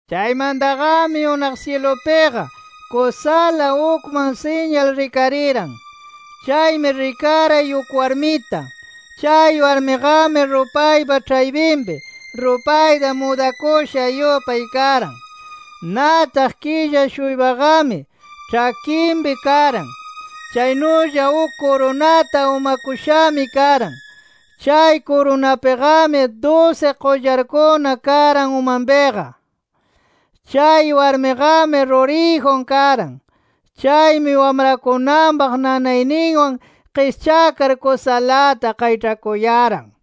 Chaymantaqami unaq syilupiqa, kusala ukman siñal rikariran. Chaymi rikaray uk warmita. Chay warmiqami, rupaypa ĉhaypinpi, rupayta mudakusha yupay karan. Nataq killa-shuypaqami ĉhakinpi karan. Chaynulla uk kurunata umakushami karan. Chay kurunapiqami dusi qullarkuna karan umanpiqa. Chay warmiqami ruriyjun karan. Chaymi wamrakunanpaq nanayninwan qischakar kusalata qayĉhakuyaran.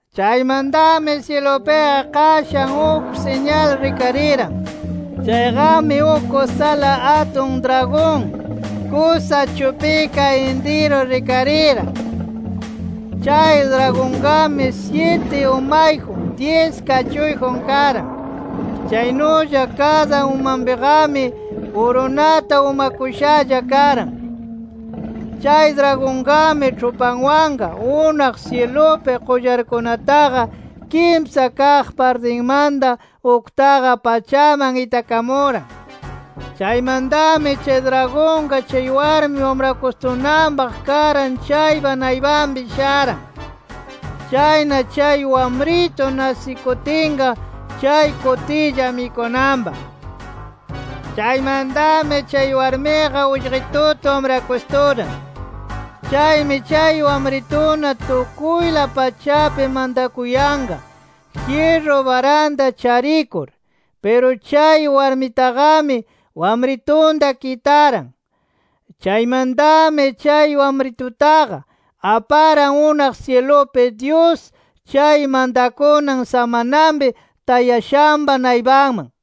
Chaymantami syilupiqa qashan uk siñal rikariran: Chayqami uk kusala atun dragon, kusa chupika intiru rikariran. Chay dragonqami syiti umayjun, dyis kachuyjun karan. Chaynulla kada umanpiqami kurunata umakushalla karan. Chay dragonqami, ĉhupanwanqa unaq syilupi qullarkunataqa kimsa kaq partinmanta uktaqa pachaman itakamuran. Chaymantami chay dragonqa chay warmi wamrakustunanpaq karan chaypa naypanpi sharan. Chayna chay wamritu nasikutinqa chay kutilla mikunanpaq. Chaymantami chay warmiqa ullqituta wamrakusturan. Chaymi chay wamrituna tukuyla pachapi mantakuyanqa, jyirru baranta charikur. Piru chay warmitaqami, wamritunta kitaran. Chaymantami chay wamritutaqa, aparan unaq syilupi Dyus chay mantakunan samanapi tayashanpa naypanman.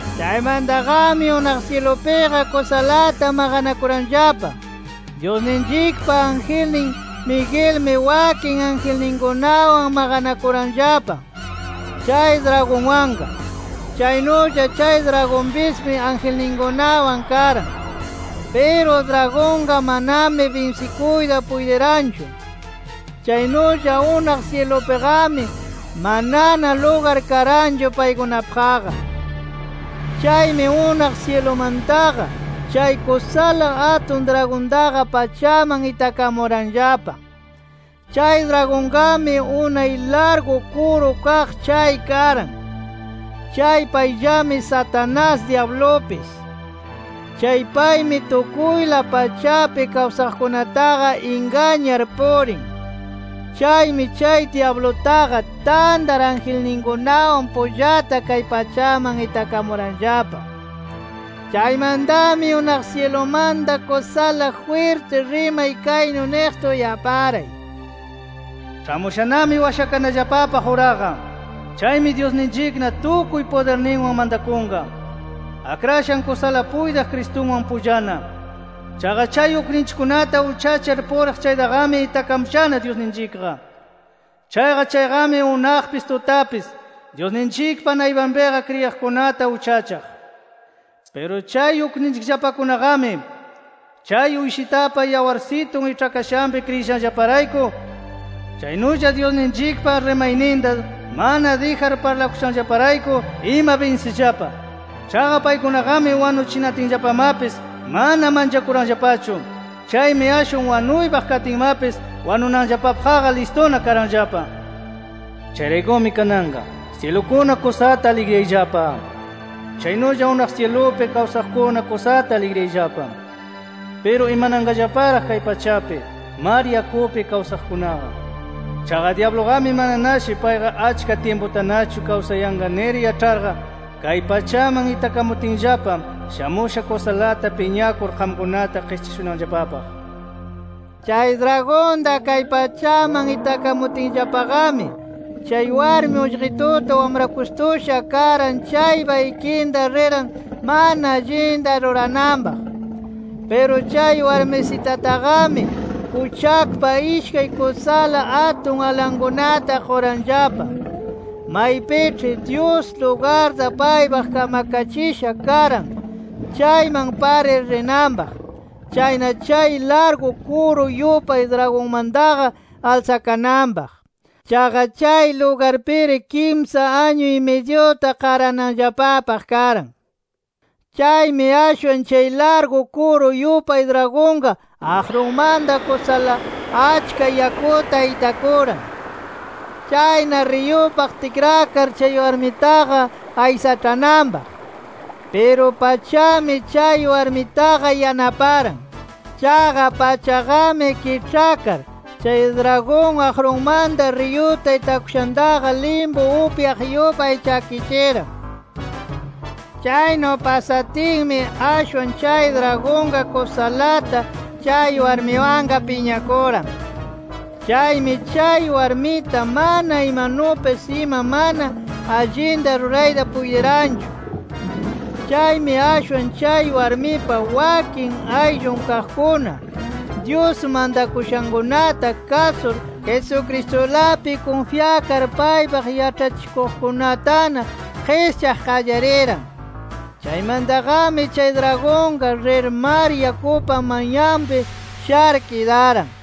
Chaymantaqami unaq syilupiqa kusalata maqanakuranllapa: Dyusninchikpa angelnin Miguelmi wakin angelninkunawan maqanakuranllapa chay dragonwanqa. Chaynulla chay dragonpismi angelninkunawan karan. Piru dragonqa manami binsikuyta puytiranchu. Chaynulla unaq syilupiqami manana lugar karanchu paykunapaqqa. Chaymi unaq syilumantaqa chay kusala atun dragontaqa pachaman itakamuranllapa. Chay dragonqami, unay largu kuru kaq chay karan. Chay payllami Satanás dyablupis. Chay paymi tukuyla pachapi kawsaqkunataqa ingañar purin. Chaymi chay dyablutaqa tantar angelninkunawan pullata kay pachaman itakamuranllapa. Chaymantami unaq syilumanta kusala jwirti rimay kaynu niqta uyaparay: “Ĉhamushanami washakanallapapaq uraqa. Chaymi Dyusninchikna tukuy pudirninwan mantakunqa, Akrashan kusala puytiq Cristunwan pullana. Chaqa chay ukninchikkunata uchachar puriq chaytaqami itakamushana Dyusninchikqa. Chaqa chayqami, unaqpis tutapis Dyusninchikpa naypanpiqa kriyiqkunata uchachaq. Piru chay ukninchikllapakunaqami chay Uyshitapa yawarsitun iĉhakashanpi kriyishanllaparayku, chaynulla Dyusninchikpa rimayninta mana dijar parlakushanllaparayku ima binsishallapa. Chaqa paykunaqami, wanuchinatinllapamapis, mana manchakuranllapachu. Chaymi ashwan wanuypaq katinmapis wanunanllapapaqqa listuna karanllapa. Chayraykumi kananqa, ¡syilukuna kusata aligriyayllapa! ¡Chaynulla unaq syilupi kawsaqkuna, kusata aligriyayllapa! ¡Piru imananqallaparaq chay pachapi, mar yakupi kawsaqkunaqa! Chaqa dyabluqami mananashi payqa achka tyimputanachu kawsayanqa nir yaĉharqa, kay pachaman itakamutinllapa shamusha kusalata piñakur qamkunata qischashunanllapapaq”. Chay dragonta kay pachaman itakamutinllapaqami, chay warmi, ullqituta wamrakustusha karan chaypa ikinta riran mana allinta rurananpaq. Piru chay warmisitataqami kuchakpa ishkay kusala atun alankunata quranllapa, maypiĉhi Dyus, lugarta paypaq kamkachisha karan, chayman parir rinanpaq. Chayna chay largu kuru yupay dragonmantaqa alsakananpaq. Chaqa chay lugarpiri kimsa añu-y-midyuta qarananllapapaq karan. Chaymi ashwan chay largu kuru yupay dragonqa aqrunmanta kusala achka yakuta itakuran, chayna riyupaq tikrakar chay warmitaqa aysaĉhananpaq. Piru pachami chay warmitaqa yanaparan. Chaqa pachaqami kiĉhakar, chay dragon aqrunmanta riyuta itakushantaqa limpu upyaq yupay chakichiran. Chaynu pasatinmi, ashwan chay dragonqa kusalata chay warmiwanqa piñakuran. Chaymi chay warmita mana imanupis ima mana allinta rurayta puytiranchu. Chaymi ashwan chay warmipa wakin ayllun kaqkuna, Dyus mantakushankunata kasur, Jesucristulapi kunfyakar, paypaq yaĉhachikuqkunatana qischaq qallariran. Chaymantaqami chay dragonqa, rir mar yakupa manyanpi shar kidaran.